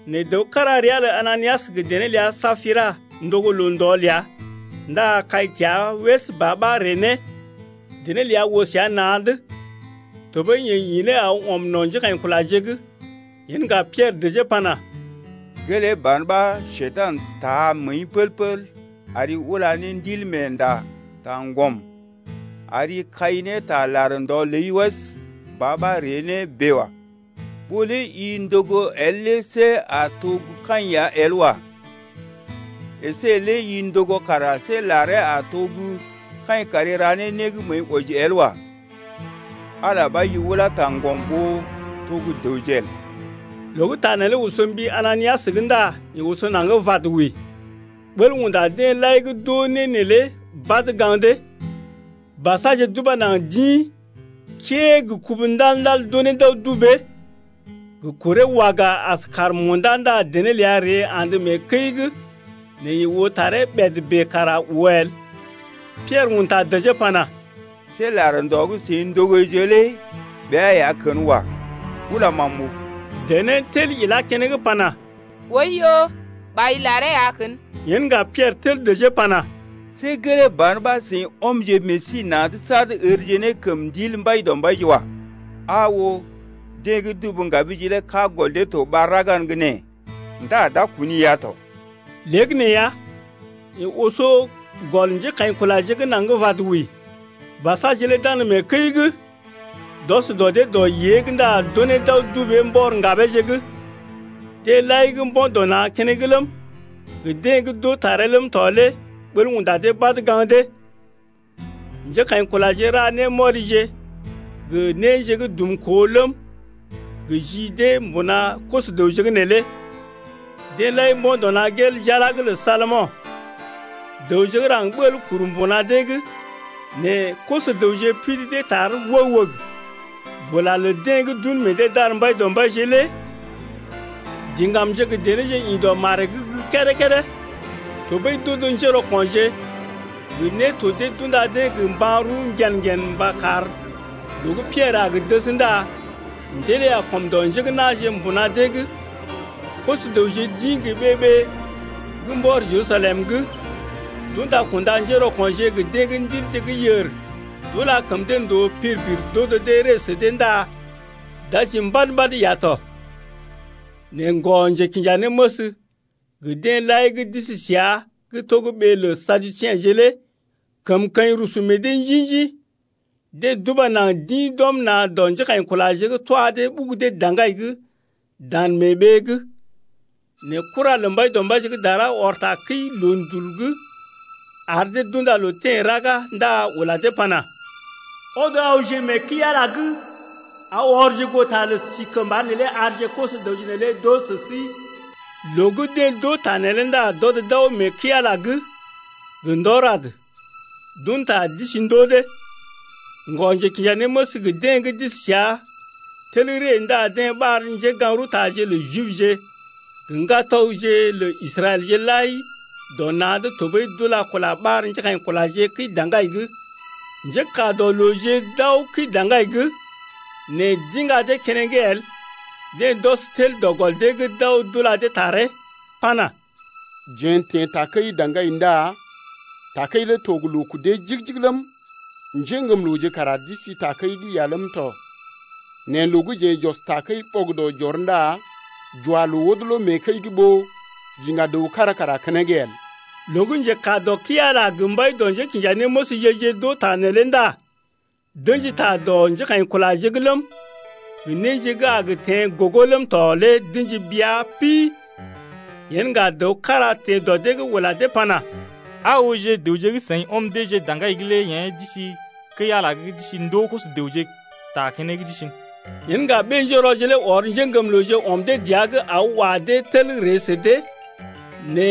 Nɛ dəw kára ria lə Ananias gə dené ləa Sapira ndogo loo-ndɔ ləa ndá kai təa wəs ba ɓa ree nee, dené ləa oo səa na̰’d, tɔɓəi yeḛ ḭ ne aw ɔm no̰ njékaḭkulaje’g. Yen ŋga Piɛrə dəjee pana: Gelee ban ɓa Njekurai taa məəi pəl-pəl ari ula ne Ndilmeenda taŋgɔm, ari kai ne ta lar ndɔ ləi wəs ba ɓa ree ne bèe wa. Ɓó lé i ndogo el lé see a to gə́ kaḭ ya el wa. Esé lé i ndogo kara see laree a to gə́ kaḭ kari ra ne né gə́ məəi wɔji el wa. Ala lé ɓa i ulá taŋgɔm ɓó to gə́ dəwje el. Loo gə́ ta neelé oso mbi Ananias’g ndá yeḛ oso naŋg vad wəi. Ɓəl unda deḛ lai gə́ d’oo né neelé badə gaŋg dee. Basaje d’uba naŋg d’ḭ, kəee gə kubu ndal-ndal, d’unee d’aw dubee. Gə kuree waga as kàr munda ndá dené ləa ree andə mee kəi’g nɛ yeḛ oo taree ɓèd bèe kara oo el. Piɛrə un ta dəjee pana: See lar ndɔ gə́ seḭ ndogoje lé ɓea ya kən wa. Ulam am m’oo. Dené tel ilá keneŋ pana: Oiyo, ɓai laree ya kən. Yen ŋga Piɛrə tel dəjee pana: See gelee ban ɓa seḭ ɔmje meḛ sí na̰’d sad ərje ne kəm Ndil Mbaidɔmbaije wa. Aa oo, deḛ gə́ dubu ŋgabije lé kaa gɔl dee to ɓar gə́ raga’n gə́ nee ndá d’a kuni-i ya tɔ. Léegəneeya, yeḛ oso gɔl njékaḭkulaje’g naŋg vad wəi. Basaje lé d’andə mee kəi’g d’ɔs dɔ dee dɔ yée’g ndá d’unee d’aw dubee mbɔr ŋgabeeje’g. Deḛ lai gə́ mbo̰ dɔ na̰ keneŋ ləm, gə deḛ gə́ d’oo taree ləm tɔ lé ɓəl unda dee badə gaŋg dee. Njékaḭkulaje ra némɔrije gə néje gə́ dumkoo ləm gə ji dee mbuna koso-dəwje’g neelé. Deḛ lai mbo̰ dɔ na̰ gel jala’g lə Salomo̰. Dəwje gə́ raŋg ɓəl kuru mbuna dee’g nɛ koso-dəwje pidi dee tar wəg-wəg. Bula lə deḛ gə́ d’un meḛ dee d’ar Mbaidɔmbaije lé diŋgamje gə denéje, ḭ dɔ maree’g gə́ kédé-kédé. Tɔɓəi d’odo njérɔko̰je gə néto dee d’unda dee gə mban-rəw ŋgen-ŋgen mba kar loo gə́ Piɛrə a gə dəs ndá ndilee a kɔm dɔ njé gə́ na̰je mbuna dee’g. Koso-dəwje d’ḭ gə ɓee-ɓee gə́ mbɔr Jerusalem’g, d’unda kunda njérɔko̰je gə deḛ gə́ ndilje gə́ yèr d’ula kəm dee ndòo pir-pir d’odo dee ree sə dee ndá d’aji mbad-mbad ya tɔ. Nɛ ŋgɔ-njekinjanéməs gə deḛ lai gə́ d’isi səa gə́ to gə́ ɓee lə Saduseḛje lé kəmkəḭ rusu meḛ dee njḭ-njḭ. Deḛ d’uba naŋg d’ḭ d’ɔm na̰ dɔ njékaḭkulaje’g twa dee ɓugu dee daŋgai’g dan mee ɓee’g. Nɛ kura lə Mbaidɔmbaije gə́ dara ɔr tarəwkəi loondul’g, ar dee d’unda loo teḛ raga ndá ula dee pana: Ɔdje awje mee kəi-Ala’g aw ɔrje goo ta lə si kəmba neelé arje koso-dəwje neelé d’oo sə sí. Loo gə́ deḛ d’oo ta neelé ndá d’ɔd d’aw mee kəi-Ala’g gə ndɔ rad, d’un ta d’isi ndoo dee. Ŋgɔ-njekinjanéməs gə deḛ gə́ d’isi səa lé tel ree ndá deḛ ɓar njégaŋ-rəwtaje lə Jibje gə ŋgatɔgje lə Israɛlje lai dɔ na̰’d tɔɓəi d’ula kula ɓar njékaḭkulaje kəi-daŋgai’g. Njékaa dɔ looje d’aw kəi-daŋgai’g nɛ d’iŋga dee keneŋ el. Deḛ d’ɔs tel dɔ gɔl dee’g d’aw d’ula dee taree pana: Jeḛ n’teḛ takəi daŋgai ndá takəi lé to gə loo kudee jigi-jigi ləm, njéŋgəmlooje kara d’isi takəi’g lé ya ləm tɔ, nɛ loo gə́ jeḛ j’ɔs takəi ɓɔgədɔ j’ɔr ndá j’wa loo wodolo mee kəi’g ɓó j’iŋga dəw kára kara keneŋ el. Loo gə́ njekaa dɔ kəi-Ala gə mbai dɔ njékinjanéməsje-je d’oo ta neelé ndá d’ə̰ji ta dɔ njékaḭkulaje’g ləm, gə néje gə́ a gə teḛ gogo ləm tɔ lé d’ə̰ji bia pi. Yen ŋga dəw kára teḛ dɔ dee’g ula dee pana: Aa ooje, dəwje gə́ seḭ ɔm deeje daŋgai’g lé yḛ̀ d’isi kəi-Ala’g d’isi ndoo koso-dəwje ta keneŋ d’isi’n. Yen ŋga ɓé-njérɔje lé ɔr njéŋgəmlooje ɔm dee dəa’g aw wa dee tel ree sə dee nɛ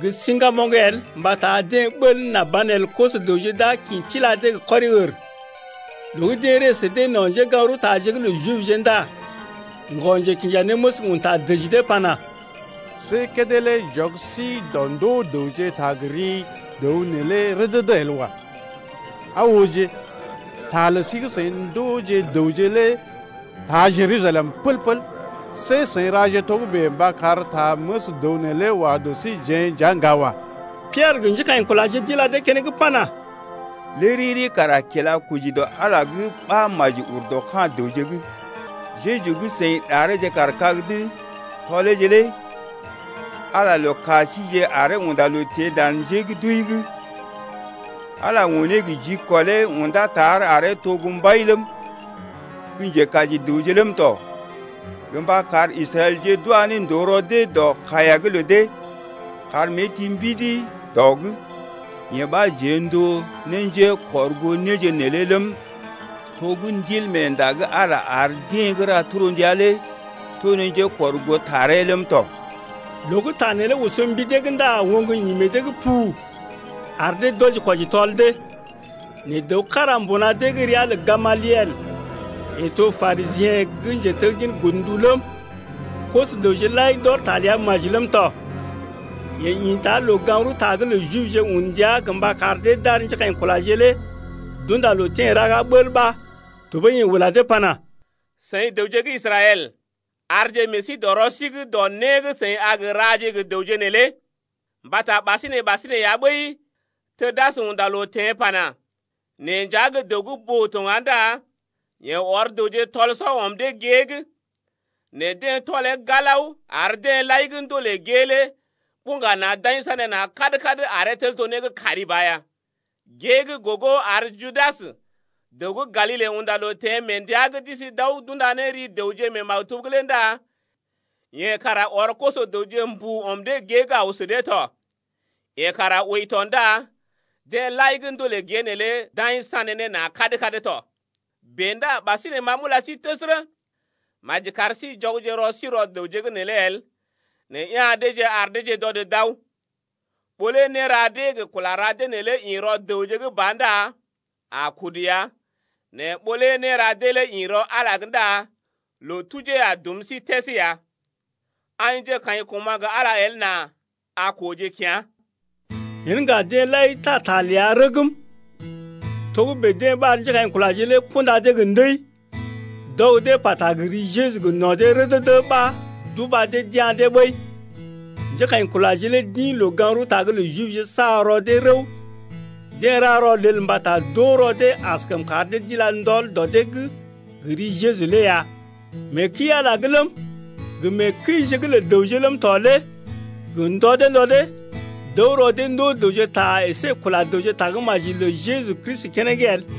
gə siŋgamoŋ el mbata deḛ ɓəl nà banelə koso-dəwje d’a kḭ tila dee gə kɔri-ər. Loo gə́ deḛ ree sə dee no̰ njégaŋ-rəwtaje’g lə Jibje ndá ŋgɔ-njekinjanéməs un ta dəji dee pana: See kédé lé j’ɔg sí dɔ ndoo dəwje ta gə ri dəw neelé rədədə el wa. Aa ooje, ta lə sí gə́ seḭ ndooje dəwje lé taa Jerusalem pəl-pəl. See seḭ raje togə́bè mba kar ta məs dəw neelé wa dɔ síjeḛ nja ŋga wa. Piɛrə gə njékaḭkulaje d’ila dee keneŋ pana: Lé riri kara kila koji dɔ Ala’g lé ɓa maji ur dɔ ka̰ dəwje’g. Jeju gə́ seḭ ɗareeje kaar kag’d tɔleeje lé Ala lə ka síjeḛ aree unda loo teḛ dan njé gə́ d’wəi’g. Ala lé unee gə jikɔlee undá tar aree to gə́ Mbai ləm, gə Njekaji dəwje ləm tɔ, gə mba kar Israɛlje d’wa ne ndòo rɔ dee dɔ kaiya’g lə dee kar mée ti ne mbidi dɔ’g. Yee ɓa jeḛ n’to ne njékɔrgoo néje neelé ləm, to gə́ Ndilmeenda gə́ Ala ar deḛ gə́ ra torndia lé to ne njekɔrgoo taree ləm tɔ. Loo gə́ ta neelé oso mbi dee’g ndá oŋg ḭ meḛ dee’g pu, ar dee d’wɔji-kwɔji tɔl dee. Nɛ dəw kára mbuna dee’g ria lə Gamaliel, yeḛ to Parisiḛ gə́ njeteggin godndu ləm, koso-dəwje lai d’ɔr ta ləa maji ləm tɔ. Yeḛ ḭta loo-gaŋg-rəwta’g lə Jibje un ndia gə mba kar dee d’ar njékaḭkulaje lé d’unda loo teḛ raga bəl ɓa. Tɔɓəi yeḛ ula dee pana: Seḭ dəwje gə́ Israɛl, arje meḛ sí dɔ rɔ sí’g dɔ né gə́ seḭ a gə raje gə dəwje neelé. Mbata ɓasinè-ɓasinè ya ɓəi Tudas unda loo teḛ pana: Neḛ nja gə́ dəw gə́ boo tɔ ŋga ndá yeḛ ɔr dəwje tɔl-sɔ ɔm dee gée’g. Nɛ deḛ tɔlee galao ar deḛ lai gə́ ndolè gée lé buŋga na̰ d’aḭ sanéna̰ kad-kad aree tel to né gə́ kari ba ya. Gée gə́ gogo ar Judas dəw gə́ Galile unda loo teḛ mee ndəa gə́ d’isi d’aw d’unda ne ri dəwje mee maktub’g lé ndá yeḛ kara ɔr koso-dəwje mbu ɔm dee gée’g aw sə dee tɔ. Yeḛ kara wəi tɔ ndá deḛ lai gə́ ndolè gée neelé d’aḭ sané ne na̰ kad-kad tɔ. Bèe ndá ɓasinè ma m’ula sí təsərə, maji kar sí jɔgje rɔ sí rɔ dəwje’g neelé el nɛ ya̰ deeje ar deeje d’ɔd d’aw. Ɓó lé néra dee gə kula ra dee neelé ḭ rɔ dəwje’g ba ndá a kudu ya. Nɛ ɓó lé néra dee lé ḭ rɔ Ala’g ndá loo tujee a dum sí təs ya. Aḭje kaḭ koma̰ gə Ala el nà a kooje kea̰. Yen ŋga deḛ lai taa ta ləa rəgm. Togə́bè deḛ ɓar njékaḭkulaje lé kunda dee gə ndəi, d’ɔg dee pata gə ri Jeju gə no̰ dee rədədə ɓa d’uba dee d’ya̰ dee ɓəi. Njékaḭkulaje lé d’ḭ loo-gaŋg-rəwta’g lə Jibje sa rɔ dee rəw. Deḛ ra rɔlel mbata d’oo rɔ dee askəm kar dee d’ila ndɔl dɔ dee’g gə ri Jeju lé ya. Mee kəi-Ala’g ləm, gə mee kəije’g lə dəwje ləm tɔ lé gə ndɔ dee ndɔ dee, d’əw rɔ dee ndoo dəwje ta əsé kula dəwje tagə́maji lə Jeju Kristi keneŋ el.